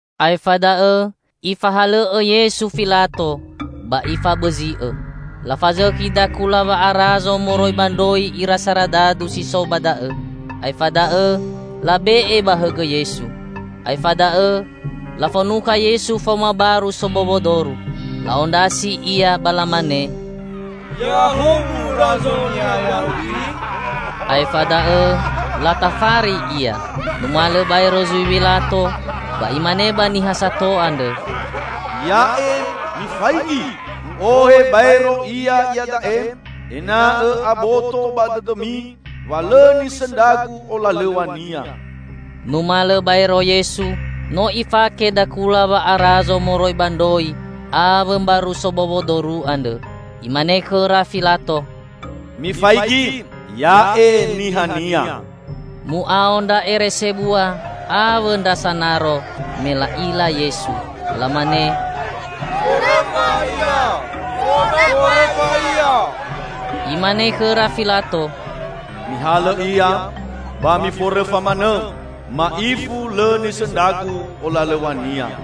Aefa da'õ ifahalõ'õ Yesu Filato ba ifabõzi'õ. Lafazõkhi dakula wa'arazo moroi ba ndroi ira saradadu si so ba da'õ, aefa da'õ labe'e ba hõgõ Yesu. Aefa da'õ lafonukha Yesu faoma baru sobowo doru, la'ondrasi Ia ba lamane, "Ya'ahowu razo niha Yahudi!" Aefa da'õ latafari Ia. Numalõ baero zui Wilato ba imane ba niha sato andrõ, "Ya'e, mifaigi! U'ohe baero Ia iada'e, ena'õ aboto ba dõdõmi wa lõ nisõndra-Gu olalõw̃a-Nia." Numalõ baero Yesu, no Ifake dakula wa'arazo moroi ba ndroi awõ mbaru sobowo doru andrõ. Imane khõra Filato, "Mifaigi! Ya'e nihania!" Mu'ao ndra ere sebua awõ ndra sanaro me la'ila Yesu, lamane, "Forõfa Ia! Forõfa Ia!" Imane khõra Filato, "Mihalõ Ia ba miforõfa manõ. Ma'ifu lõ nisõndra-Gu olalõw̃a-Nia."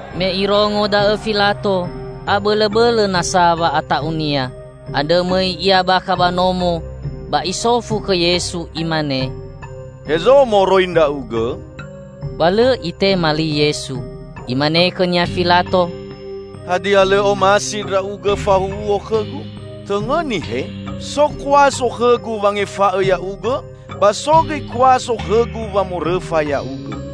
Me irongo da'õ Filato abõlõbõlõ nasa wa'ata'unia. Andrõ mõi ia bakha ba nomo ba isofu khõ Yesu imane, "Hezo moroi Ndra'ugõ?" Ba lõ Itema li Yesu. Imane khõnia Filato, "Hadia lõ omasi Ndra'ugõ fahuhuo khõgu? Tõngõni, he! So kuaso khõgu wangefa'õ Ya'ugõ, ba so gõi kuaso khõgu wamorõfa Ya'ugõ!"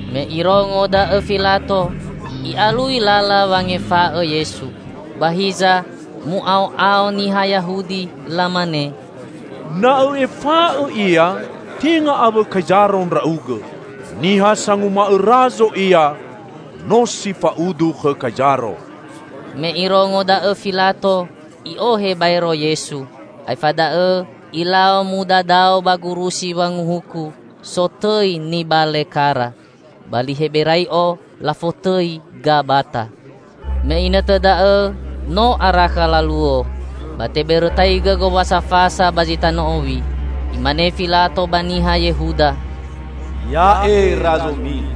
Me irongo da'õ Filato, i'alui lala wangefa'õ Yesu. Ba hiza mu'ao'ao niha Yahudi lamane, "Na õ'efa'õ Ia, tenga awõ Kaizaro ndra'ugõ! Niha sanguma'õ razo ia, no si fa'udu khõ Kaizaro!" Me irongo da'õ Filato, i'ohe baero Yesu, aefa da'õ ilau mudadao ba gurusi wanguhuku sotõi Nibale kara. (Ba li Heberai'o lafotõi Gabata.) Me inõtõ da'õ no arakha laluo; ba tebõrõtaigõ Gowasa Fasa ba zi tanõ owi. Imane Filato ba niha Yehuda, "Ya'e razomi!"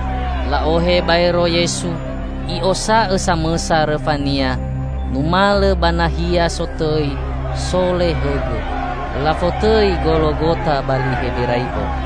La'ohe baero Yesu, I'osa'õ samõsa rõfa-Nia numalõ ba nahia sotõi "Sole Hõgõ". (Lafotõi Gologota ba li Heberai'o.)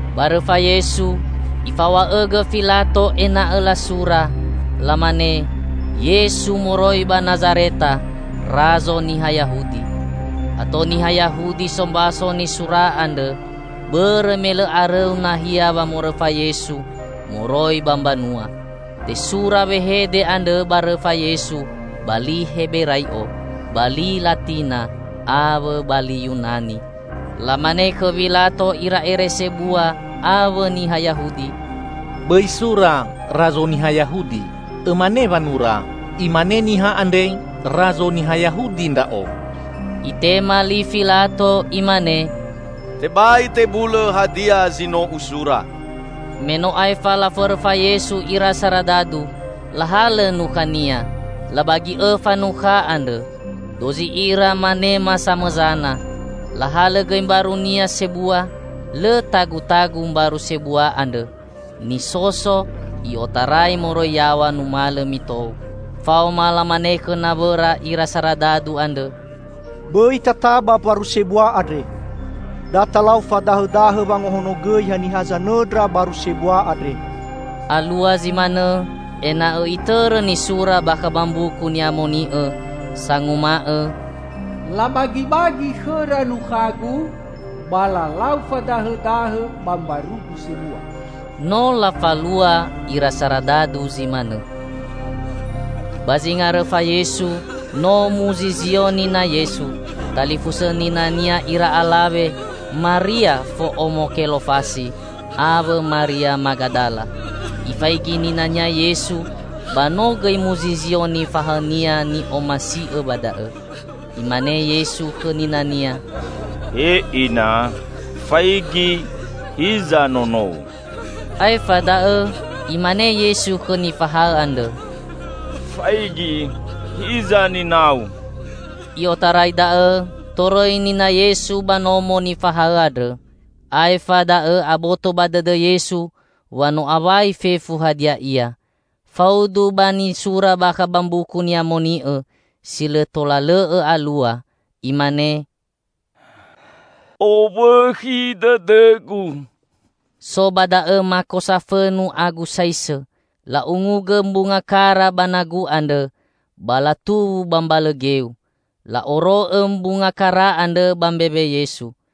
Ba rõfa Yesu, ifaw̃a'õgõ Filato ena'õ lasura, lamane: "Yesu moroi ba Nazareta, Razo Niha Yahudi". Ato niha Yahudi sombaso nisura andrõ, bõrõ me lõ arõu nahia wamorõfa Yesu moroi ba mbanua. Tesura wehede andrõ ba rõfa Yesu ba li Heberai'o, ba li Latina, awõ ba li Yunani. Lamane khõ Wilato ira ere sebua awõ niha Yahudi, "Bõi sura 'Razo niha Yahudi', õmane wanura, 'Imane niha andre, Razo niha Yahudi Ndra'o.'" Itema li Filato imane, "Tebai tebulõ hadia zi no usura!" Me no aefa laforõfa Yesu ira saradadu, lahalõ nukha-Nia. Labagi õfa nukha andrõ: dozi ira manema zamõsana. Lahalõ gõi mbaru-Nia sebua. Lõ tagutagu mbaru sebua andrõ -- nisoso i'otarai moroi yaw̃a numalõ mitou. Faoma lamane khõ nawõra ira saradadu andrõ, "Bõi tataba mbaru sebua andre. Da talau fadahõdahõ wangahonogõi haniha zanõndra baru sebua andre." Alua zi manõ ena'õ itõrõ nisura bakha ba Mbuku Ni'amoni'õ, sanguma'õ: "Labagibagi khõra nukhagu, ba lalau fadahõdahõ ba mbarugu sebua." No lafalua ira saradadu zi manõ. Ba zinga rõfa Yesu no muzizio nina Yesu, talifusõ nina-Nia ira alawe Maria fo'omo Kelofasi, awõ Maria Magadala. Ifaigi nina-Nia Yesu ba no gõi muzizio nifahaõ-Nia ni'omasi'õ ba da'õ. Imane Yesu khõ nina-Nia, "He Ina, faigi, hiza nonou." Aefa da'õ imane Yesu khõ nifahaõ andrõ, "Faigi, hiza ninau." I'otarai da'õ, torõi nina Yesu ba nomo nifahaõ andrõ. Aefa da'õ aboto ba dõdõ Yesu wa no awai fefu hadia ia; faudu ba nisura bakha ba Mbuku Ni'amoni'õ, si lõ tola lõ'õ alua, imane, "Owõkhi dõdõ-Gu." So ba da'õ mako safõnu agu saisõ. La'ungugõ mbunga kara ba nagu andrõ, ba latuwu ba mbalõ geu. La'oro'õ mbunga kara andrõ ba mbewe Yesu.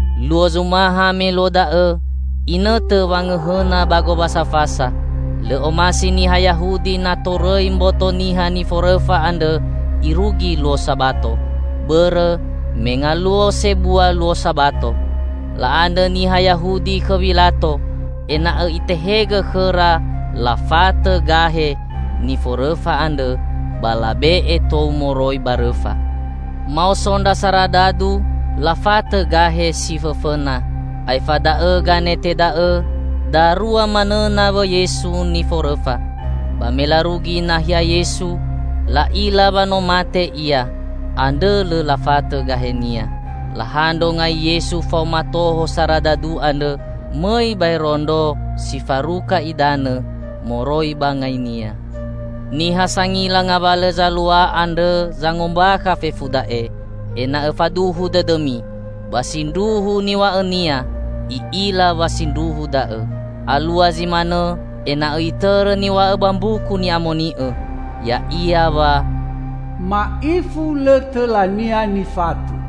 Luo zumaha me luo da'õ, inõtõ wangõhõna ba Gowasa Fasa. Lõ omasi niha Yahudi na torõi mboto niha niforõfa andrõ irugi luo Sabato. Bõrõ me ngaluo sebua luo Sabato. La'andrõ niha Yahudi khõ Wilato ena'õ itehegõ khõra lafatõ gahe niforõfa andrõ ba labe'e tou moroi ba rõfa. Maoso ndra saradadu lafatõ gahe si fõfõna, aefa da'õ ganete da'õ, darua manõ nawõ Yesu niforõfa. Ba me larugi nahia Yesu, la'ila wa no mate Ia. Andrõ lõ lafatõ gahe-Nia. Lahandro ngai Yesu faoma toho saradadu andrõ; mõi baero ndro si faruka idanõ moroi ba ngai-Nia. Niha sangila ngawalõ zalua andrõ zangombakha fefu da'e, ena'õ faduhu dõdõmi. Ba sindruhu niw̃a'õnia; i'ila wa sindruhu da'õ. Alua zi manõ ena'õ itõrõ niw̃a'õ ba Mbuku Ni'amoni'õ, ya'ia wa, "Ma'ifu lõ tõla-Nia nifatõ".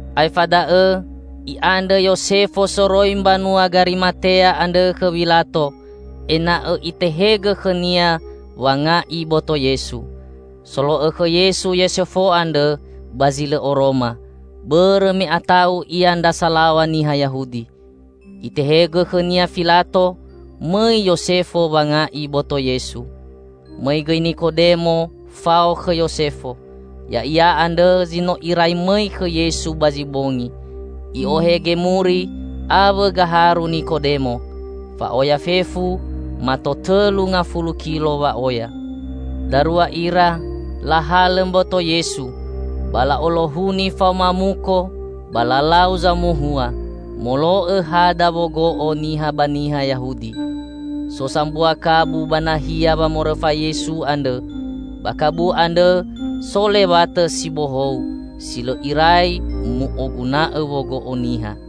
Aefa da'õ i'andrõ Yosefo soroi mbanua Garimatea andrõ khõ Wilato ena'õ itehegõ khõnia wanga'i boto Yesu. (Solo'õ khõ Yesu Yosefo andrõ ba zi lõ oroma, bõrõ me ata'u ia ndra salaw̃a niha Yahudi.) Itehegõ khõnia Filato, mõi Yosefo wanga'i boto Yesu. Mõi gõi Nikodemo fao khõ Yosefo. Ya'ia andrõ zi no irai mõi khõ Yesu ba zi bongi. I'ohe gemuri awõ gaharu Nikodemo. Fa'oya fefu mato tõlu ngafulu kilo wa'oya. Darua ira lahalõ mboto Yesu ba la'olohuni faoma muko ba lalau zamohua molo'õ hada wogo'o niha ba niha Yahudi. So sambua kabu ba nahia wamorõfa Yesu andrõ. Ba kabu andrõ so lewatõ si bohou, si lõ irai mu'oguna'õ wogo'o niha.